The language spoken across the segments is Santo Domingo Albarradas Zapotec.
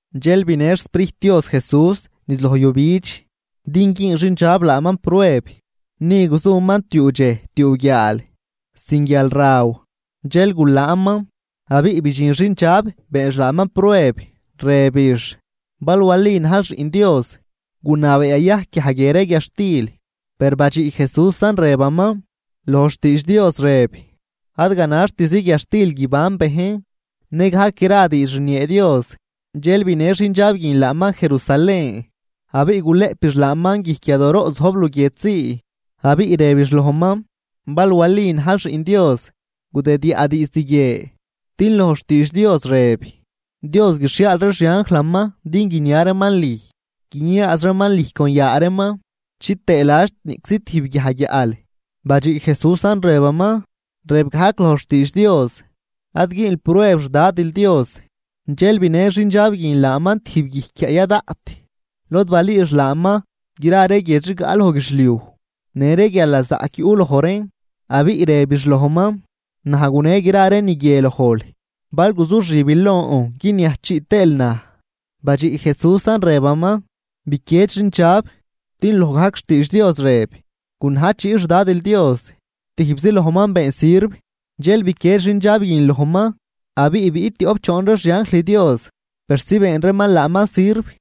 Dxel binë xSprijt Dios Jesús niz loj yujbidx, din güün xindxab laaman prueb. Ni guzuman tiuu dxej tiuu guiaal sin guialraw, dxel gulaanman. Abiꞌ bidxin xindxab beenx laaman prueb, rëbix: ―Bal wali najl xiꞌn Dios, gunabee yayajc guiaj guie ree guiadxtil. Per badxiꞌ Jesúsan rëbaman: ―Loj xtiidx Dios rëb: “Ad ganaxtizi guiadxtil guiban bejn, nëgajc gra diidx rniee Dios.” Dxel binë xindxab guin laaman Jerusalén, abiꞌ gulëꞌpix laaman guijc yadooroꞌ zojb luguiedxzii, abiꞌ rëbix lojman: ―Bal wali najl xiꞌn Dios, gudidyaꞌ diizd guie, din loj xtiidx Dios rëb: Dios guixhiaal ree xianjlaman din guinia reeman lüj. Guiniaaz reeman lüj con yaa reeman chitëë ladx niꞌczi tijb guiaj guiaꞌl. Badxiꞌ Jesúsan, rëbaman: ―Rëb gajc loj xtiidx Dios: “Ad güünl prueb xDadil Dios.” Dxel binë xindxab guin laaman tijb guijc guiaꞌ ya daꞌt, lod balüüx laaman gra ree guiedx rigaꞌ loj guidxliuj në ree guialnazaꞌc yuꞌ loj reen. Abiꞌ rebix lojman: ―Naj gune gra ree ni guie lojl, bal guzuxibil lon guiniajchiꞌ tëël naj. Badxiꞌ Jesúsan, rëbaman: ―Biquied, xindxab, din loj gajc xtiidx Dios rëb: “Gunajchiꞌ xDadil Dios, tijbzi lojman been sirv.” Dxel biquied xindxab guin lojman, abiꞌ biꞌt tioꞌp choon ree xianjl Dios persi been reeman laaman sirv.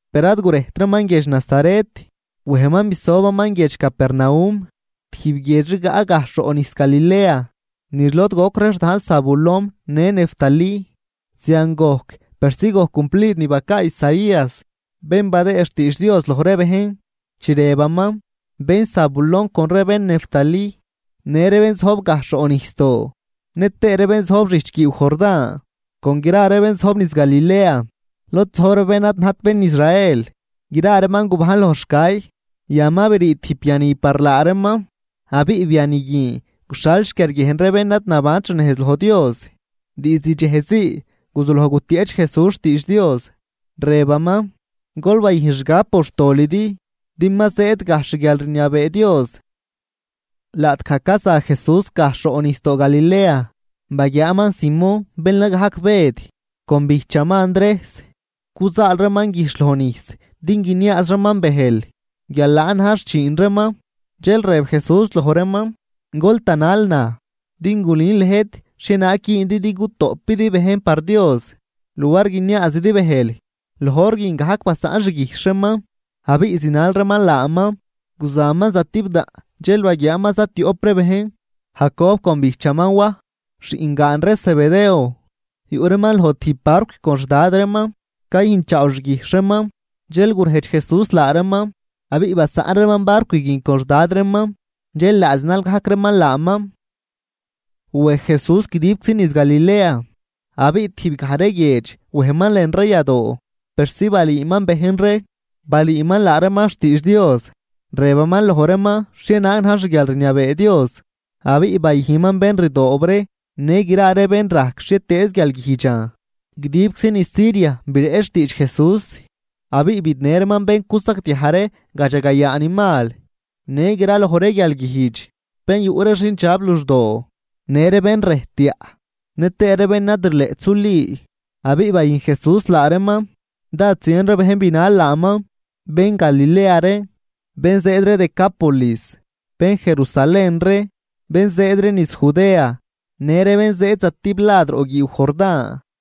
Per ad gurejtraman guiedx Nazaret, wejman bisobaman guiedx Capernaum, tijb guiedx rigaꞌ gajxh roꞌ nijs Galilea niz lod goc ree xdajn Zabulón në Neftalí. Zian gojc persi gojc cumplid ni bacaa Isaías, bén badëë xtiidx Dios loj ree bejn, chi rëbaman: Bén Zabulón con ree bén Neftalí, në ree bén zojb gajxh roꞌ nijsdoo, nëtëë ree bén zojb xijch guiiw Jordán con gra ree bén zojb niz Galilea, lod zojb ree bén ad najt bén Israel, gra reeman gubajn loj xcay. Yan ma brii tijb biani par laa reeman, abiꞌ biani guin guxhal xquiarguiejn ree bén ad nabant xnejz loj Dios. Diizd dxejzii guzuloj gutieꞌch Jesús xtiidx Dios, rëbaman: ―Gol bayüjn xgab por xtolidi din ma zëëd gajxh xguialrniabee Dios. Laꞌtgaj caza Jesús gajxh roꞌ nijsdoo Galilea, baguiaaman Simón bén la gajc Bëd con bijchaman Andrejs. Cuzaal reeman guijxh loj nijs din guiniaaz reeman bëjl. Guial laan na̱j xchiin reeman. Dxel rëb Jesús loj reeman: ―Gol tanal naj, din gulün lëjt xhienaag güündi din gutoꞌpidi bejn par Dios luar guiniaazidi bëjl. Loj hor guin gajc basaꞌn xguijxh reeman abiꞌ zinal reeman laaman. Guzaman zatibdaꞌn dxel baguiaaman zatioꞌp ree bejn, Jacob con bijchaman Waj, xiꞌngaan ree Zebedeo. Yuꞌ reeman loj tijb barcw con xdad reeman cayüjnchaaw xguijxh reeman. Dxel gurejdx Jesús laa reeman, abiꞌ basaꞌn reeman barcw guin con xdad reeman, dxel laa zinal gajc reeman laaman. Wej Jesús guidibczi niz Galilea, abiꞌ tijbgaj ree guiedx wejman lën ree yadoo persi balüüman bejn ree. Balüüman laa reeman xtiidx Dios, rëbaman loj reeman xhienaag na̱j xguialrniabee Dios, abiꞌ bayüjnman bén rdoob ree në gra ree bén rajc xhietëëz guialguijdxan. Guidibczi niz Siria bireꞌch xtiidx Jesús, abiꞌ bidnë reeman bén cusagdiaj ree gadxagayaa ni mal në graloj ree guialguijdx, bén yuꞌ ree xindxab luxdoo, në ree bén rëjtyaꞌ, nëtëë ree bén ad rileꞌt suli, abiꞌ bayüjn Jesús laa reeman. Dád zien ree bejn binal laaman, bén Galilea ree, bén zëëd ree Decápolis, bén Jerusalén ree, bén zëëd ree niz Judea në ree bén zëëd stiblad roꞌ guiiw Jordán.